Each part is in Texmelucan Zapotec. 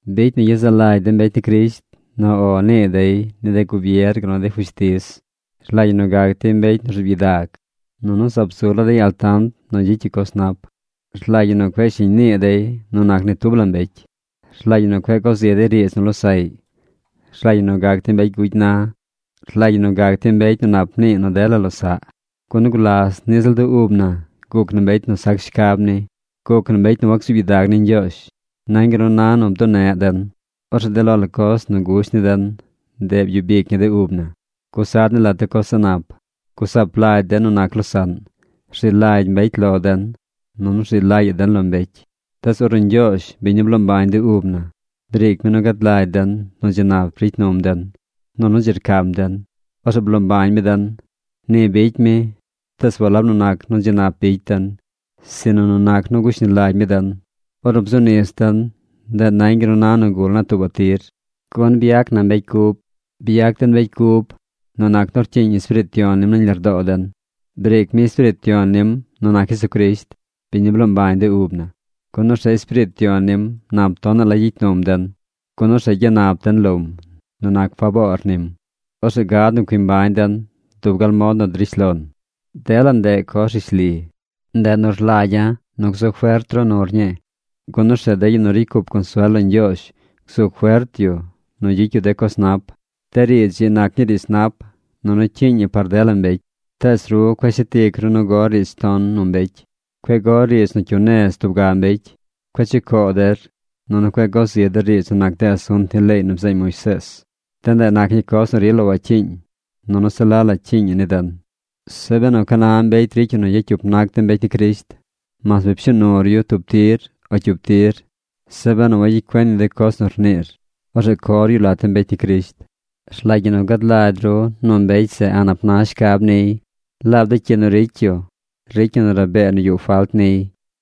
Bicy nu gyezaꞌ lagy de mbecy ni Crisht nu “O” nii dey ni de gubier gal nu ni de fushtiz. Rlagy ñi nu gac dey mbecy nu rzuub gyidag. Nunu zaab zu la dey altant nu gyicy yu coz nap. Rlagy ñi nu cueꞌ shiñ nii dey nu nac ni tub la mbecy. Rlagy ñi nu cueꞌ go zi dey riidz nu losaꞌy. Rlagy ñi nu gac dey mbecy gugy na. Rlagy ñi nu gac dey mbecy nu nap nii nu dela losaꞌ. Gun gulas niꞌ ziꞌl de ub na guc na mbecy nu sac shcab ni. Guc na mbecy nu wacsuub gyidag ni Ñgyoozh. Nañ gal nu na nu bduneꞌ den. Orzeꞌ de lo la coz nu gusht ni den, ndeꞌ byub ic ñi de ub na. Gusa den lat de coz a̱ꞌ nap. Gusaap lagy den nu nac losaꞌn. Rzi lagy mbecy lo den, nunu rzi lagy den lo mbecy. Tees ornu Ñgyoozh, biñ nu bloo mbañ de ub na, briic mi nu gad lagy den nu dzi nap ricy num den, nunu dzi rcam den, orzeꞌ bloo mbañ mi den. Ni bicy mi, tees walab nu nac nu dzi nap bicy den, sinu nu nac nu gushni lagy mi den. Ornu bzu nis den, ndeꞌ nañ gal nu na nu gul naa tuubaꞌ tir, gun byac na mbecy cub. Byac den mbecy cub nu nac nu rcyiiñ Espiriit Yon nim nañ lardoo den. Briic mi Espiriit Yon nim nu nac Jesucrisht, biñ nu bloo mbañ de ub na. Gun orzeꞌ Espiriit Yon nim nap tonaꞌ la gyicy num den. Gun orzeꞌ gyanap den lom nu nac faboor nim. Orzeꞌ gad nu cui mbañ den dub gal mod nu drish lon. Dela ndeꞌ coz rishli. Ndeꞌ nu rlagya̱ nu gzu fert ru nur ñii, gun orzeꞌ de yu nu ricy cup consuel lo Ñgyoozh gzu fert yu nu gyicy yu de coz nap. De riidz ii nac ñii riidz nap, nunu cyiiñ ñi par dela mbecy. Tees ru cueꞌ shet ic ru nu gor riidz ton nu mbecy. Cueꞌ gor riidz nu cyu nez tub ga mbecy. Cueꞌ chucoo der. Nunu cueꞌ go zi der riidz nu nac de asunt ni leey nu bzeeñ Moisees. De ndeꞌ nac ñii coz nu rila wacyiiñ. Nunu se la la cyiiñ ñi ni den. Zeꞌ benu ca na mbecy ricy yu nu yacyup nac de mbecy ni Crisht, mas bi pshuu nur yu tub tir o cyup tir, zeꞌ benu wagyicy cuen yu de coz nu rniir, orzeꞌ cor yu lat de mbecy ni Crisht. Rlagy ñi nu gad lagy ru nu mbecy zeꞌ a̱ꞌ nap na shcab niy. Laab de cyi nu ricy yu ricy ñi nu rabee nu yuꞌ falt niy.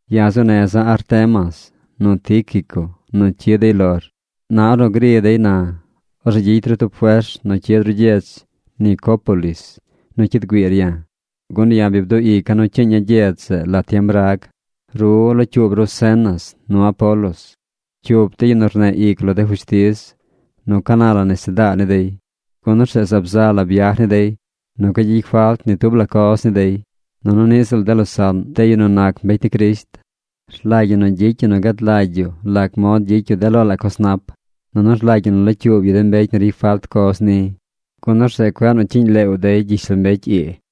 Ya̱ zuu neza̱ Artemas nu Tíquico nu cyid dey lor. Na ornu gri dey na, orzeꞌ gyicy ru tub fers nu cyid ru gyedz Nicópolis nu cyid güiir ya̱. Gun ya̱ bi bduꞌ ica̱ nu cyiiña̱ gyedz zeꞌ lat tiem rag. Ru, locyuub ru Zenas nu Apolos, cyup de yu nu rneꞌ ic lo de fushtiz, nu ca na la nesedaa ni dey, gun orzeꞌ zaab za la byaj ni dey nu cueꞌ gyicy falt ni tub la coz ni dey. Nunu niꞌ ziꞌl de losaꞌn, de yu nu nac mbecy ni Crisht, rlagy ñi nu gyicy yu nu gad lagy yu lac mod gyicy yu de lo la coz nap, nunu rlagy ñi nu locyuub yu de mbecy nu ricy falt coz ni, gun orzeꞌ cueꞌ nu cyiiñ leew dey gyishlombecy ii.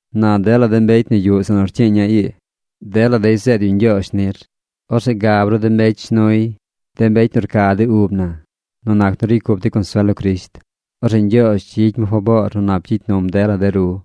Na dela de mbecy nu yuꞌ zeꞌ nu rcyiiña̱ ii, dela dey zeed yu ñgyoozh nir. Orzeꞌ gab ru de mbecy shnuy, de mbecy nu rca de ub na nu nac nu ricy cup dey consuel lo Crisht. Orzeꞌ Ñgyoozh gyicy mi faboor nu nap gyicy num dela de ru.